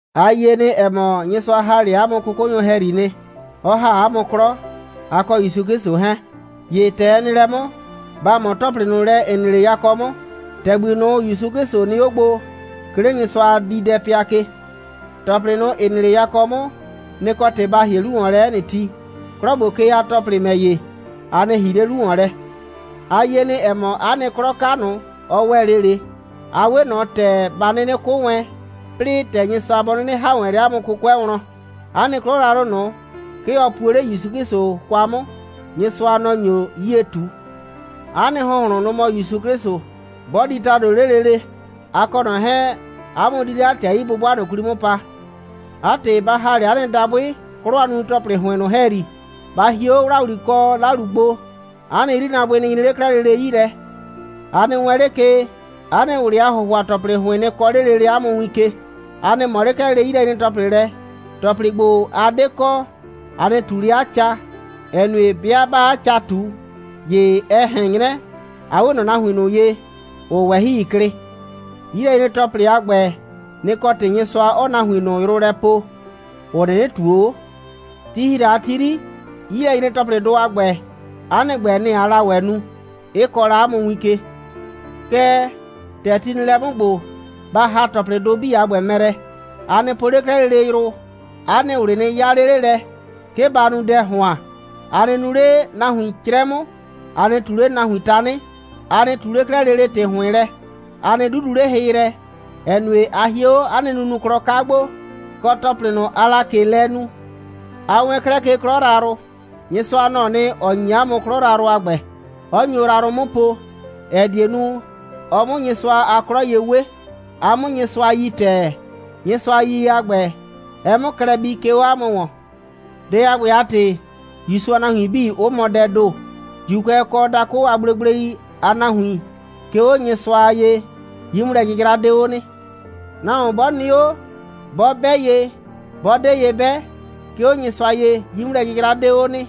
A yie nɩ, ‑ɛ mɔ, Nyɩsʋa ‑ha 'le 'a mʋ 'kʋkʋnyʋ ‑hɛyri nɩ, 'ɔ ‑ha 'a mʋ 'klɔ, a kɔ ‑Yusu 'Klɩsʋ 'hɛɛn. ‑Ye ‑tɛ ɛ nɩ lɛ 'mʋ, ba ꞊mɔ ‑tɔplɩ ꞊nʋ lɛ, ‑ɩ nɩ 'le yakɔ 'mʋ, ‑tɛgbi ꞊nʋ, ‑Yusu 'Klɩsʋ nɩ 'o gbo, 'ke 'le Nyɩsʋa a diidɛpɩa ke. ‑Tɔplɩ ꞊nʋ, ‑ɩ nɩ 'le yakɔ 'mʋ, nɩ‑ kɔ ‑tɩ ba ‑hie 'lu ‑wɔn lɛ 'ɛ nɩ ti. 'Klɔ ‑gbo ke a ‑tɔplɩ ‑mɛ ‑ye, a nɩ ‑hi 'le 'lu ‑wɔn lɛ. A yie nɩ, ‑ɛ mɔ, 'a nɩ 'klɔ 'ka ꞊nʋ, ɔ ‑wɛ 'le ꞊le, a 'we ꞊nɔ ‑tɛ ba 'nɩnɩ 'kʋ wɛn, 'plɩɩ ‑tɛ Nyɩsʋa bɔ 'nɩnɩ ‑ha wɛn 'le 'a mʋ 'kʋkʋɛ wlɔn. 'A nɩ 'klɔ yrayrʋ ꞊nʋ, 'ke ɔ puo 'le ‑Yusu 'Klɩsʋ kwa 'mʋ. Nyɩsʋa, nɔ‑ nyo 'yie ꞊tu. 'A nɩ ‑hʋnhlʋn, nʋ‑ mɔ ‑Yusu 'Klɩsʋ. 'Bɔ di ‑tado 'le lele, a kɔ ꞊nɔ 'hɛɛn, 'a mʋ di 'le 'a ‑tɩ a 'yi'bʋbʋa ꞊nʋ 'kwli 'mʋ pa. 'A ‑tɩ, ba ‑ha 'le 'a nɩ dabʋɩ 'klɔ a nunu‑tɔplɩ ‑hʋɩn ꞊nʋ ‑hɛyri. Ba hie 'o ‑wlawli kɔ 'lalu gbo, 'a nɩ 'yrinaabʋɩ nɩ nyre 'le 'klɛɛ lele 'yi lɛ. A nɩ wɛɛn 'le ke, 'a nɩ ꞊wlɩ a ‑hʋhʋa‑tɔplɩ ‑hʋɩn nɩ kɔɔ 'le lele 'a mʋ win ke. A nɩ ꞊mɔ 'le 'klɛɛ lele 'yilɛnyre‑tɔplɩ lɛ. ‑Tɔplɩ ‑gbo, a 'de kɔ, a nɩ ꞊tu 'le 'a ca, ‑ɛ nue, 'bɩa 'baa 'a ca ꞊tu, ‑ye ɛ ꞊hɛn 'nyrɛ, a 'we ꞊nɔ nahuin ꞊nʋ ye, ‑ʋʋ ꞊wɛhɩi klɩ. 'Yilɛnyre‑tɔplɩ a ‑gbɛ, nɩ‑ kɔ ‑tɩ Nyɩsʋa 'ɔɔ nahuin ꞊nʋ yrʋ lɛ poo, ‑ʋ 'nɩnɩ ꞊tuo 'o. Ti ‑hi la a ti 'yri, 'yilɛnyre‑tɔplɩdʋ a ‑gbɛ, 'a nɩ ‑gbɛ, nɩ‑ aa la ‑wɛ nu, 'ɩ kɔɔ la 'a mʋ win ke. Kɛɛ, ‑tɛ ti nɩ lɛ 'mʋ ‑gbo, ba ‑ha ‑tɔplɩdʋ 'bii a ‑gbɛ mɛ lɛ. A nɩ po 'le 'klɛɛ lele yrʋ, 'a nɩ ꞊wlɩ nɩ 'yaa 'le 'le lɛ, 'ke ba nu dɛ ‑hʋan, a nɩ nu 'le nahuin 'crɛ 'mʋ, a nɩ ꞊tu 'le nahuin tanɩ, a nɩ ꞊tu 'le 'klɛɛ lele ‑tɩ ‑hʋɩn lɛ, a nɩ 'dudu 'le hɩ yrɛ, ‑ɛ nue, a hie 'o 'a nɩ nunuklɔ 'ka gbo, kɔ ‑tɔplɩ ꞊nʋ, aa la ꞊ke lɛ nu. A wɛɛn 'klɛɛ ke 'klɔ yrayrʋ. Nyɩsʋa, nɔ‑ɔ nɩ, ‑ɔ ‑nyi 'a mʋ 'klɔ yrayrʋ a ‑gbɛ, 'ɔ nyo yrayrʋ 'mʋ po, ‑ɛ die nu, ɔ 'mʋ Nyɩsʋa a 'klɔ ye 'we, a 'mʋ Nyɩsʋa yi ‑tɛɛ, Nyɩsʋa a yiyie a ‑gbɛ, ɛ 'mʋ klɛ bii, 'ke 'o 'a mʋ ‑wɔn. Dɛ a ‑gbɛ a ‑tɩ, ‑Yusu a nahuin 'bii, 'ʋ mɔ dɛɛ ‑do. ‑Juukʋɛ kɔ dakʋ a gblegblei a nahuin, 'ke 'o Nyɩsʋa ye, 'yi'mʋlɛ'jɩjra 'de 'o nɩ. Nahuon 'bɔ nɩ 'o, 'bɔ 'bɛ ye, 'bɔ 'de ye 'bɛ, 'ke 'o Nyɩsʋa ye, 'yi'mʋlɛ'jɩjra 'de 'o nɩ.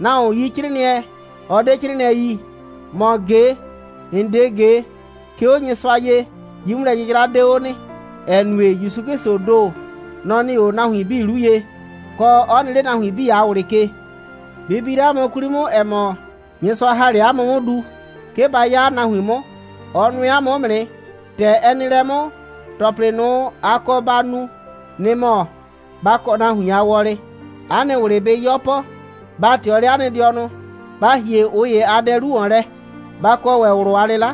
Nahuon yi 'crɩɩnɩɛ, ɔ 'de 'crɩɩnɩɛ yi, ‑mɔ ꞊ge, ‑n 'de ꞊ge, 'ke 'o Nyɩsʋa ye, 'yi'mʋlɛ'jɩjra 'de 'o nɩ, ‑ɛ nue, ‑Yusu 'Klɩsʋʋ ‑do, nɔ‑ nɩ 'o nahuin 'bii 'lu ye, kɔ, 'ɔ nɩ 'le 'a nahuin 'bii a ꞊wlɩ ke. Bɩ bi 'le 'a mʋ 'kwli 'mʋ, ‑ɛ mɔ, Nyɩsʋa ‑ha 'le 'a mʋ 'mʋ du, 'ke ba 'ya 'a nahuin 'mʋ. Ɔ nʋɛ 'a mʋ 'mʋ nɩ. ‑Tɛ ɛ nɩ lɛ 'mʋ, ‑tɔplɩ ꞊nʋ, a kɔ ba nu, nɩ‑ mɔ: Ba kɔ nahuin a wɔlɩ, 'a nɩ ꞊wlɩ bɩ 'yɔpɔ, ba ꞊tɩɔ 'le 'a nɩ dɩɔnʋ, ba ‑hie ꞊ʋ ‑ye a dɛ 'lu ‑wɔn lɛ, ba kɔ ‑wɛ ꞊wlʋ a 'lɩla.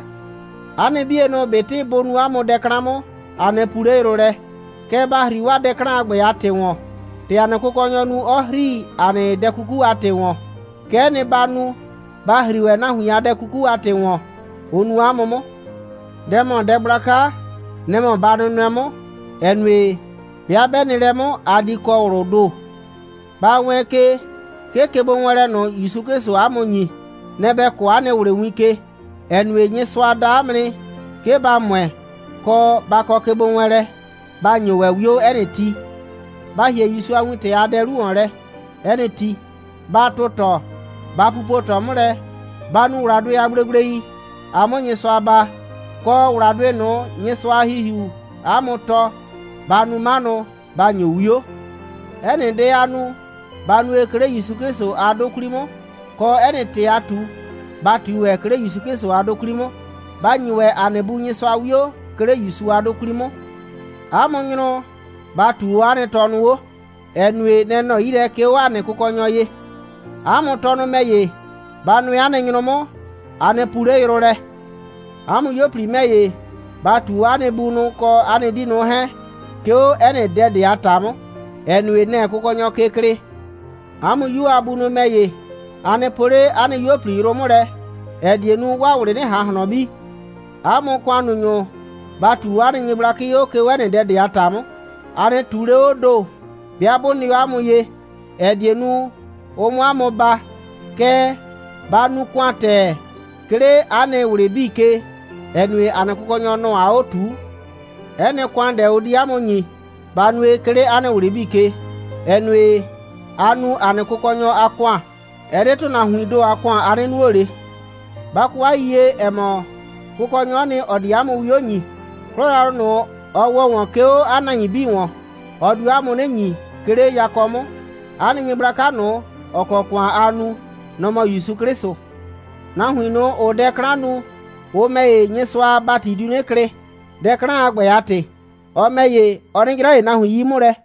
'A nɩ 'bienʋ, ꞊betɩ bʋ nu 'a mʋ dɛ 'klan 'mʋ, a nɩ puu 'le yrʋ lɛ, kɛɛ, ba ‑hri dɛ 'klan a ‑gbɛ a ‑tɩ ‑wɔn. ‑Tɛ ‑a nɩ Kʋkɔnyɔ nu, 'ɔ ‑hri ‑a nɩ dɛ 'kuku a ‑tɩ ‑wɔn, kɛ'ɛ nɩ, ‑ba nu, ‑ba ‑hri ‑wɛ nahuin a dɛ 'kuku a ‑tɩ ‑wɔn, ʋ nu ‑a mʋ 'mʋ. Dɛ ‑mɔ dɛ gblaka, nɛ‑ mɔ ba nʋnʋɛ 'mʋ, ‑ɛ nue, 'bɩa 'bɛ nɩ lɛ 'mʋ, a di kɔ ꞊wlʋʋ ‑do. Ba wɛɛn ke, 'ke kegbowɛɛnlɛ ꞊nʋ, ‑Yusu 'Klɩsʋʋ 'a mʋ ‑nyi, nɛ‑ ‑bɛ kɔɔ 'a nɩ ꞊wlɩ win ke, ‑ɛ nue, Nyɩsʋa da 'a mʋ nɩ, 'ke ba ‑mʋɛ, kɔ, ba kɔ kegbowɛɛnlɛ. Ba ‑nyo ‑wɛ 'wio 'ɛ nɩ ti. Ba ‑hie ‑Yusu a wintɛ a dɛ 'lu ‑wɔn lɛ 'ɛ nɩ ti. Ba tʋtɔɔ. Ba pupo ꞊tɔ 'mʋ lɛ. Ba nu ‑wladʋɩ a gblegblei, a 'mʋ Nyɩsʋa baa, kɔ ‑wladʋɩ ꞊nʋ, Nyɩsʋa a ‑Hihiuu 'a mʋ tɔɔ. Ba nu 'manʋ, ba ‑nyo 'wio. 'Ɛ nɩ dɛ, aa nu, ba nue, 'ke 'le ‑Yusu 'Klɩsʋ a 'dʋ 'kwli 'mʋ, kɔ, 'ɛ nɩ ‑tɩ, aa ꞊tu, ba ꞊tui ‑wɛ, 'ke 'le ‑Yusu 'Klɩsʋ a 'dʋ 'kwli 'mʋ. Ba ‑nyi ‑wɛ ‑a nɩ Bu Nyɩsʋa 'wio, 'ke 'le ‑Yusu a 'dʋ 'kwli 'mʋ. 'A mʋ nyrʋ, ba ꞊tuu 'o 'a nɩ tɔnʋ 'o, ‑ɛ nue, nɛ‑ nɔ 'yi lɛ, 'ke 'o ‑a nɩ Kʋkɔnyɔ ye. 'A mʋ tɔnʋ ‑mɛ ‑ye, ba nʋɛ 'a nɩ nyrʋ 'mʋ, a nɩ puu 'le yrʋ lɛ. 'A mʋ 'yuo꞊pli ‑mɛ ‑ye, ba ꞊tuu 'o 'a nɩ bunʋ, kɔ 'a nɩ 'diinʋ 'hɛɛn, 'ke 'o 'ɛ nɩ dɛ ꞊de a ‑ta 'mʋ, ‑ɛ nue, nɛ‑ɛ Kʋkɔnyɔ ke klɩɩ. 'A mʋ 'yuo a bunʋ ‑mɛ ‑ye, a nɩ poo 'le 'a nɩ 'yuo꞊pli yrʋ 'mʋ lɛ, ‑ɛ die nu, 'waa ꞊wlɩ 'nɩ ꞊han ꞊hlɔn bi. 'A mʋ ‑kʋannunyʋ, ba ꞊tuu 'o 'a nɩ nyɩgblakɩ 'o, 'ke 'o 'ɛ nɩ dɛ ꞊de a ‑ta 'mʋ. A nɩ ꞊tuu 'le 'oo ‑do, 'bɩa 'bʋ nɩ 'o 'a mʋ ye, ‑ɛ die nu, ʋ 'mʋ 'a mʋ baa. Kɛɛ, ba nu ‑kʋan ‑tɛɛ, 'ke 'le 'a nɩ ꞊wlɩ 'bii ke, ‑ɛ nue, ‑a nɩ Kʋkɔnyɔ, nɔ‑ aa 'o ꞊tuu. 'Ɛ nɩ ‑kʋandɛ, ʋ di 'a mʋ ‑nyi, ba nue, 'ke 'le 'a nɩ ꞊wlɩ 'bii ke, ‑ɛ nue, aa nu ‑a nɩ Kʋkɔnyɔ a ‑kʋan. Ɛ 'de ‑tʋnahuiin ‑do a ‑kʋan, a 'nɩ nuo ꞊le. Ba kɔ 'a yiyie, ‑ɛ mɔ, Kʋkɔnyɔ'ɔ nɩ, ‑ɔ di 'a mʋ 'wio ‑nyi. 'Klɔ yrayrʋ ꞊nʋ, ɔ ‑wɔ ‑wɔn, 'ke 'o 'a nahuin ‑wɔn, ɔ dio 'a mʋ 'nɩ ‑nyi, 'ke 'le yakɔ 'mʋ. 'A nɩ Nyɩgblaka ꞊nʋ, ‑ɔ kɔ ‑kʋan aa nu, nɔ‑ mɔ ‑Yusu 'Klɩsʋ. Nahuin ꞊nʋ, ‑ʋʋ dɛ 'klan nu, ʋ ‑mɛ ‑ye, Nyɩsʋa a ‑bati diu 'nɩ klɩ, dɛ 'klan a ‑gbɛ a ‑tɩ. Ɔ ‑mɛ ‑ye, ɔ 'nɩ 'jra ꞊le nahuin 'yi 'mʋ lɛ.